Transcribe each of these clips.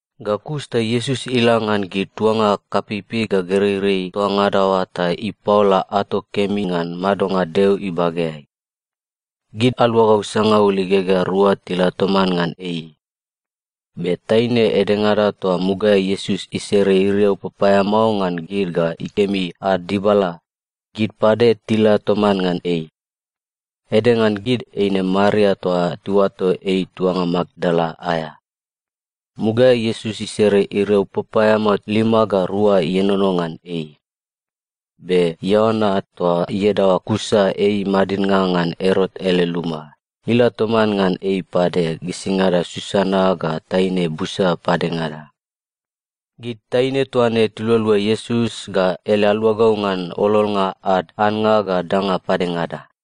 Ga kus ta Iesus ila ngan gid tuanga kapeipei ga gereirei toa ngada oa ta ipaola ato kemi ngan madonga Deo ibageai. Gid aluagau sangaul igegea rua tila toman ngan ei. Be taine edengada toa mugaeai Iesus isere iriau papaeamao ngan gid ga ikemi ad dibala, gid pade tila toman ngan ei. Ede ngan gid eine Maria toa tiuato ei tuanga Makdala aea. Mugaeai Iesus isere iriau papaeamao lima ga rua ienono ngan ei. Be Ioana (toa iadaoa Kusa ei madidnga ngan Erot ele luma) ila toman ngan ei pade gisingada Susana ga taine busa padengada. Gid taine toa ne tilualua Iesus ga ele aluagau ngan ololnga ad annga ga danga padengada.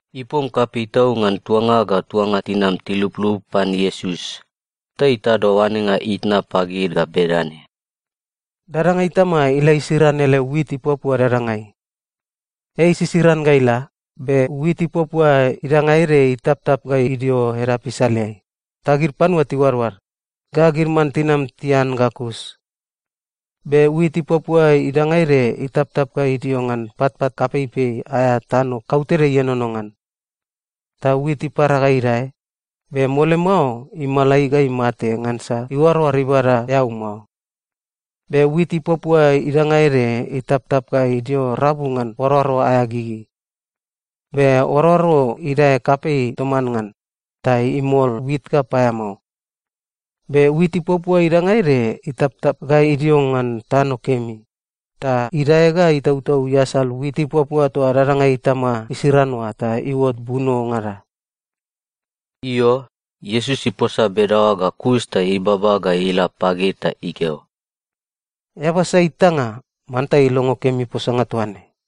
Ipom kapei tau ngan tuanga ga tuanga tinam tiluplup pan Iesus, ta itado oanenga itna pagid ga bedane, “Dadanga itama ila isiran ele wit ipuapua dadangai. Ei isisiran ga ila, be wit ipuapua idanga ede itaptap ga idio edap isaleai, ta gid panua tiuadoad, ga gid man tinam tian ga kus. Be wit ipuapua idanga ede itaptap ga idio ngan patpat kapeipei aea tano kautede ienono ngan. Ta wit ipara ga idae, be mole mao imalai ga imate ngansa iuaroar ibada eau mao. Be wit ipuapua idanga ede itaptap ga idio rabu ngan oaroaro aea gigi. Be oaroaro idae kapei toman ngan, ta imol wit ga paeamao. Be wit ipuapua idanga ede itaptap ga idio ngan tano kemi, ta idae ga itautau iasal wit ipuapua toa dadanga itama isiran oa ta iuot bunongada.” Io, Iesus iposa bedaoa ga kus ta ibaba ga ila pagid ta ikeo, “Eaba sai itanga, manta ilongo kemi posanga toaine.”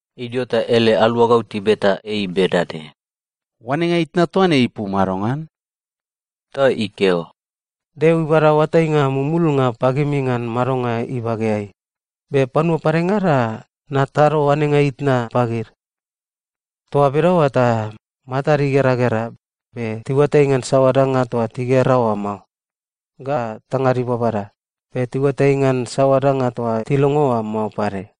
Idio ta ele aluagau tibeta ei bedane, “Oanenga itna toa ne ipu madongan?” Ta ikeo, “Deo ibada oatainga mumulnga pagimi ngan madonga ibageai, be panua padengada, natado oanenga itna pagid. Toa bedaoa ta, “‘Matad igeragera, be tiuatai ngan saoa danga toa tigera oa mao, ga tangad ibabada, be tiuatai ngan saoa danga toa tilongo oa mao pade.’”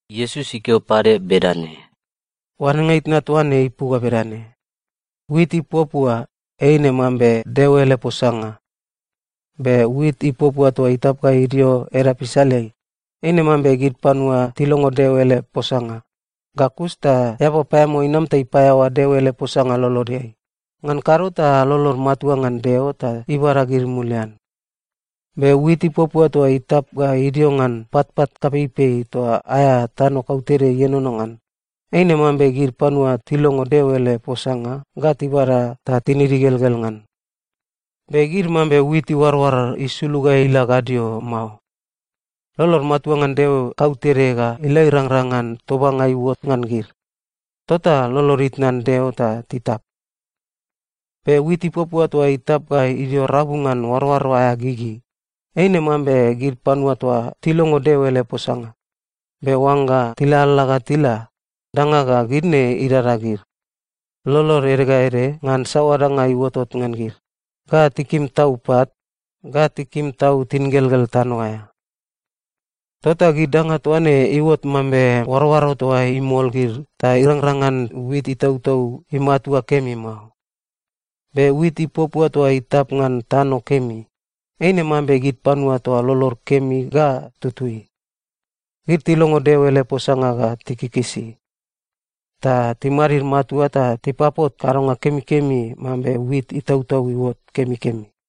Iesus ikeo pade bedane, “Oanenga itna toa ne ipu ga bedane: Wit ipuapua, eine mambe Deo ele posanga. Be wit ipuapua toa itap ga idio edap isaleai, eine mambe gid panua tilongo Deo ele posanga, ga kus ta eaba paeamao inam ta ipaeaoa Deo ele posanga lolodeai, ngan kado ta lolod matua ngan Deo ta ibada gid mulian. Be wit ipuapua toa itap ga idio ngan patpat kapeipei toa aea tano kautede ienono ngan, eine mambe gid panua tilongo Deo ele posanga ga tibada ta tinid igelgel ngan. Be gid mambe wit iuaroar isulug ga ila gadio mao. Lolod matua ngan Deo kautede ga ila irangrang ngan tobanga iuot ngan gid, tota lolod itnan Deo ta titap. Be wit ipuapua toa itap ga idio rabu ngan oaroaro aea gigi, eine mambe gid panua toa tilongo Deo ele posanga, be oangga tilalala ga tila, danga ga gid ne idada gid: lolod ede ga ede ngan saoa danga iuotot ngan gid, ga tikim tau pat, ga tikim tau tingelgel tano aea. Tota gid danga toa ne iuot mambe oaroaro toa imol gid ta irangrang ngan wit itautau imatua kemi mao. Be wit ipuapua toa itap ngan tano kemi, eine mambe gid panua toa lolod kemi ga tutui. Gid tilongo Deo ele posanga ga tikikisi. Ta timadid matua ta tipapot kadonga kemikemi mambe wit itautau iuot kemikemi.”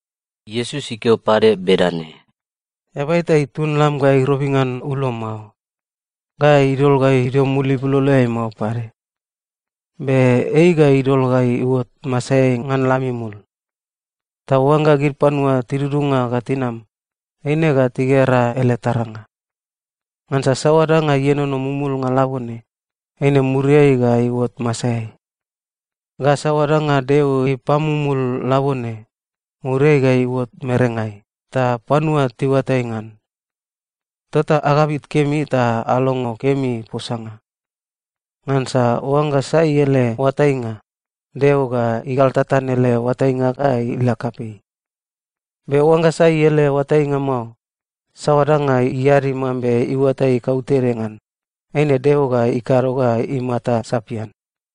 Iesus ikeo pade bedane, “Eaba eta itun lam ga irobi ngan ulo mao. Ga idol ga idio mul ibuloloeai mao pade. Be ei ga idol ga iuot masaeai ngan lam imul. Ta oangga gid panua tidudunga ga tinam, eine ga tigera ele taranga. Ngansa saoa danga ienono mumulnga labone, eine muriai ga iuot masaeai. Ga saoa danga Deo ipamumul labone, muriai ga iuot merengai, ta panua tiuatai ngan. Tota agabit kemi ta alongo kemi posanga. Ngansa oangga sai ele oatainga, Deo ga igaltatan ele oatainga ga ila kapei. Be oangga sai ele oatainga mao, saoa danga iadi mambe iuatai kautede ngan, eine Deo ga ikado ga imata sapian.”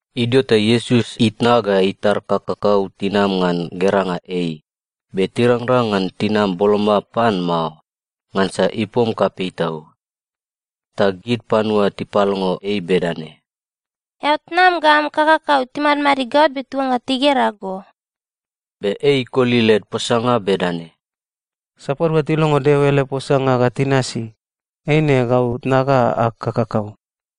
Idio ta Iesus itna ga itar kakakau tinam ngan geranga ei, be tirangrang ngan tinam boloma pan mao, ngansa ipom kapei tau. Ta gid panua tipalongo ei bedane, “Eao tnam ga am kakakau timadmadid gaot be tiuangga tigera go.” Be ei ikoli led posanga bedane, “Sapadua tilongo Deo ele posanga ga tinasi, eine gau tnag ga ag kakakau.”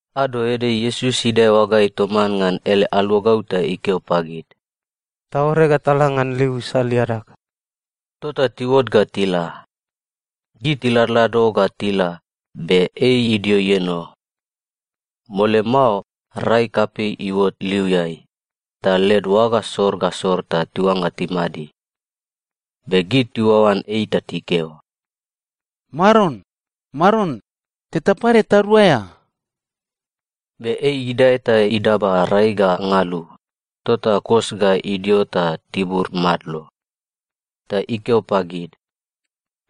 Ado ede Iesus idae oagaeai toman ngan ele aluagau ta ikeo pagid, “Taore ga tala ngan liu isal iadag.” Tota tiuot ga tila. Gid tiladlado ga tila, be ei idio ieno. Mole mao, rai kapei iuot liuiai, ta led oaga sor ga sor ta tiuangga timadi. Be gid tiuaoan ei ta tikeo, “Maron, Maron, teta pade taduaea!” Be ei idae ta idaba rai ga ngalu, tota kos ga idio ta tibur madlo. Ta ikeo pagid,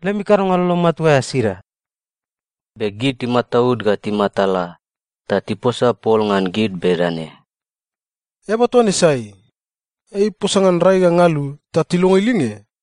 “Lemi kadonga lolo matua aea sida?” Be gid timataud ga timatala, ta tiposa pol ngan gid bedane, “Eaba toa ne sai? Ei iposa ngan rai ga ngalu ta tilongo ilinge!”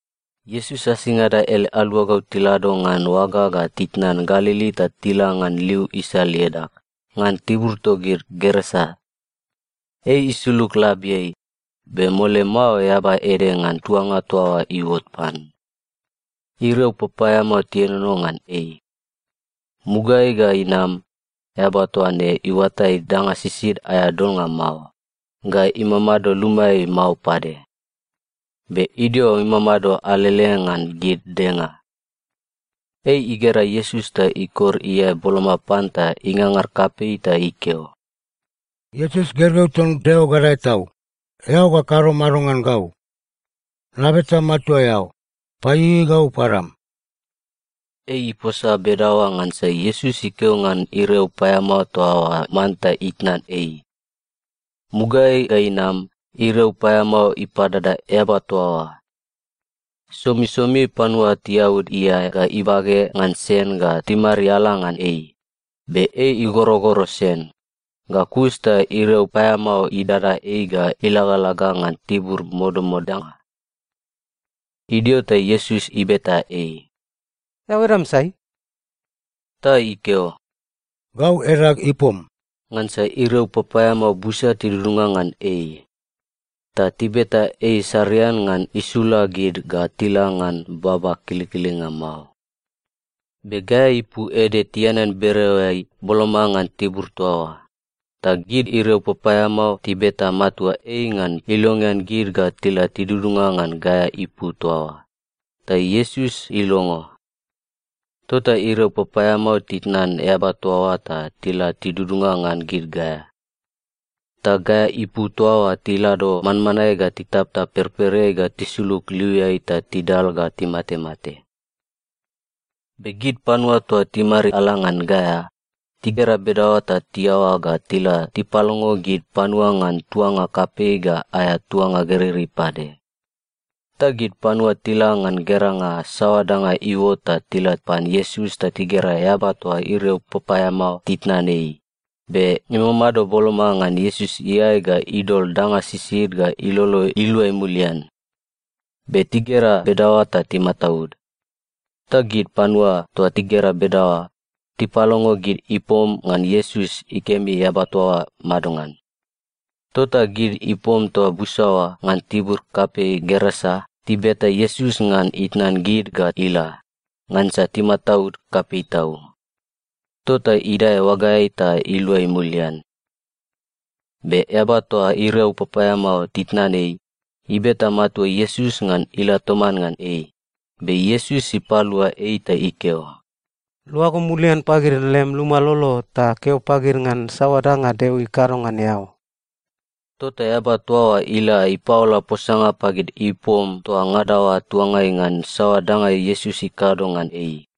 Iesus asingada ele aluagau tilado ngan oaga ga titnan Galili ta tila ngan liu isal iadag, ngan tibur togid Gerasa. Ei isulug labiai, be mole mao eaba ede ngan tuanga toa oa iuot pan. Iriau papaeamao tienono ngan ei. Mugaeai ga inam, eaba toa ne iuatai danga sisid aea dolnga mao, ga imamado lumaeai mao pade. Be idio imamado alele ngan gid denga. Ei igera Iesus ta ikor iae boloma pan ta ingangar kapei ta ikeo, “Iesus, gergeu ton Deo Gadae Tau, eao ga kado mado ngan gau? Nabeta matua eao, paieiei gau padam!” Ei iposa bedaoa ngansa Iesus ikeo ngan iriau paeamao toa oa manta itnan ei. Mugaeai ga inam, iriau paeamao ipadada eaba toa oa. Somisomi panua tiaud iae ga ibage ngan sen ga timariala ngan ei, be ei igorogoro sen, ga kus ta iriau paeamao idada ei ga ilagalaga ngan tibur modamodanga. Idio ta Iesus ibeta ei, “Eao edam sai?” Ta ikeo, “Gau edag Ipom,” ngansa iriau papaeamao busa tidudunga ngan ei. Ta tibeta ei sarian ngan isula gid ga tila ngan baba kilikilinga mao. Be gaea ipu ede tianean bereoeai boloma ngan tibur toa oa, ta gid iriau papaeamao tibeta matua ei ngan ilongean gid ga tila tidudunga ngan gaea ipu toa oa, ta Iesus ilongo. Tota iriau papaeamao titnan eaba toa oa ta tila tidudunga ngan gid gaea. Ta gaea ipu toa oa tilado manmanae ga titaptap perpereai ga tisulug liuiai ta tidal ga timatemate. Be gid panua toa timariala ngan gaea, tigera bedaoa ta tiaoa ga tila tipalongo gid panua ngan tuanga kapei ga aea tuanga gereirei pade. Ta gid panua tila ngan geranga saoa danga iuot ta tila pan Iesus ta tigera eaba toa iriau papaeamao titnan ei, be imamado boloma ngan Iesus iae ga idol danga sisid ga ilolo iluai mulian. Be tigera bedaoa ta timataud. Ta gid panua toa tigera bedaoa, tipalongo gid ipom ngan Iesus ikemi eaba toa oa madongan. Tota gid ipom toa busa oa ngan tibur kapei Gerasa tibeta Iesus ngan itnan gid ga ila, ngansa timataud kapei tau. Tota idae oagaeai ta iluai mulian. Be eaba toa iriau papaeamao titnan ei, ibeta matua Iesus ngan ila toman ngan ei, be Iesus ipalua ei ta ikeo, “Luago mulian pagid lem luma lolo ta keo pagid ngan saoa danga Deo ikado ngan eao.” Tota eaba toa oa ila ipaola posanga pagid ipom toa ngada oa tuangai ngan saoa danga Iesus ikado ngan ei.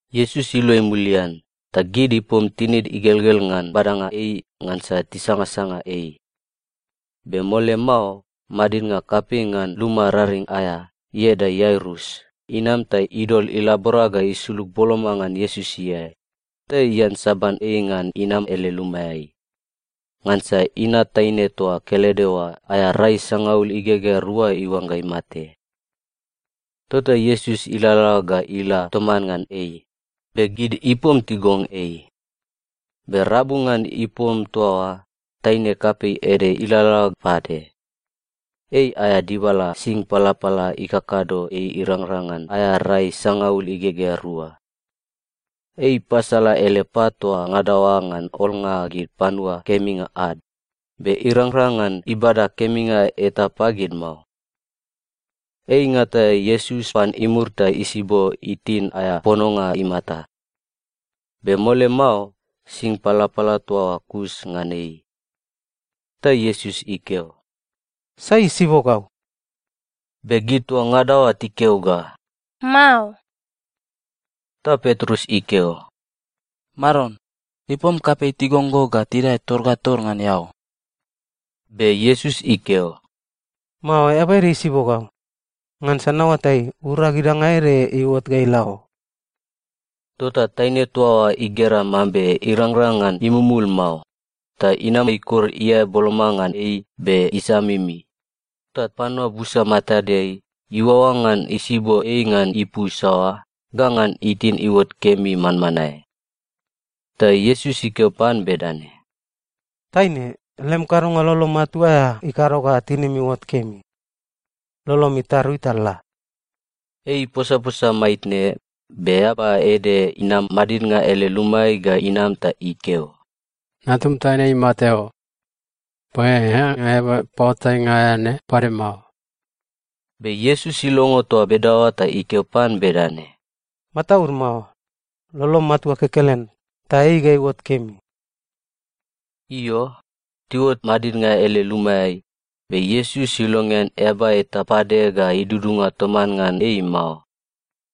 Iesus iluai mulian, ta gid ipom tinid igelgel ngan badanga ei ngansa tisangasanga ei. Be mole mao, madidnga kapei ngan luma raring aea, ieda Iairus, inam ta idol ilabora ga isulug boloma ngan Iesus iae, ta iansaban ei ngan inam ele lumaeai. Ngansa inat taine toa kelede oa aea rai sangaul igegea rua iuangga imate. Tota Iesus ilalala ga ila toman ngan ei, be gid ipom tigong ei. Be rabu ngan ipom toa oa, taine kapei ede ilalala pade. Ei aea dibala sing palapala ikakado ei irangrang ngan aea rai sangaul igegea rua. Ei ipasala ele pat toa ngada oa ngan olnga gid panua keminga ad, be irangrang ngan ibada keminga eta pagid mao. Ei ingata Iesus pan imur ta isibo itin aea pononga imata. Be mole mao, sing palapala toa oa kus ngan ei. Ta Iesus ikeo, “Sai isibo gau?” Be gid toa ngada oa tikeo ga, “Mao.” Ta Petrus ikeo, “Maron, ipom kapei tigong go ta tidae tor ga tor ngan eao.” Be Iesus ikeo, “Mao, eaba ede isibo gau, ngansa naoatai, urag idanga ede iuot ga ila o.” Tota taine toa oa igera mambe irangrang ngan imumul mao, ta inam ikor iae boloma ngan ei be isamimi, ta panua busa matadeai, iuaoa ngan isibo ei ngan ipu saoa, ga ngan itin iuot kemi manmanae. Ta Iesus ikeo pan bedane, “Taine, lem kadonga lolo matua aea ikado ga tinim iuot kemi. Lolom itarui ta la.” Ei iposaposa maitne, be eaba ede inam madidnga ele lumaeai ga inam ta ikeo, “Natum taine imate o. Paeaea eaba paoatainga aea ne pade mao.” Be Iesus ilongo toa bedaoa ta ikeo pan bedane, “Mataud mao. Lolom matua kekelen, ta ei ga iuot kemi.” Io, tiuot madidnga ele lumaeai, be Iesus ilongean eaba eta pade ga idudunga toman ngan ei mao.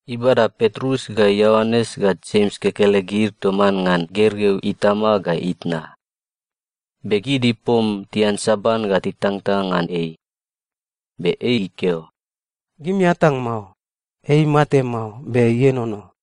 Ibada Petrus ga Ioanes ga Jems kekelegid toman ngan gergeu itama ga itna. Be gid ipom tiansaban ga titangtang ngan ei. Be ei ikeo, “Gimi atang mao. Ei imate mao, be ienono.”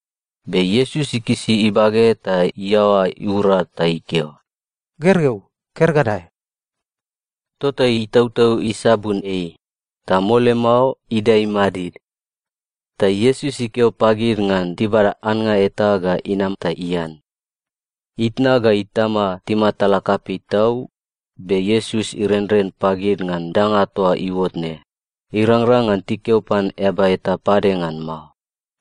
Be Iesus ikisi ibage ta iaoa ura ta ikeo, “Gergeu, ker ga dae!” Tota itautau isabun ei, ta mole mao idae imadid. Ta Iesus ikeo pagid ngan tibada annga eta ga inam ta ian. Itna ga itama timatala kapei tau, be Iesus irenren pagid ngan danga toa iuot ne, irangrang ngan tikeo pan eaba eta pade ngan mao.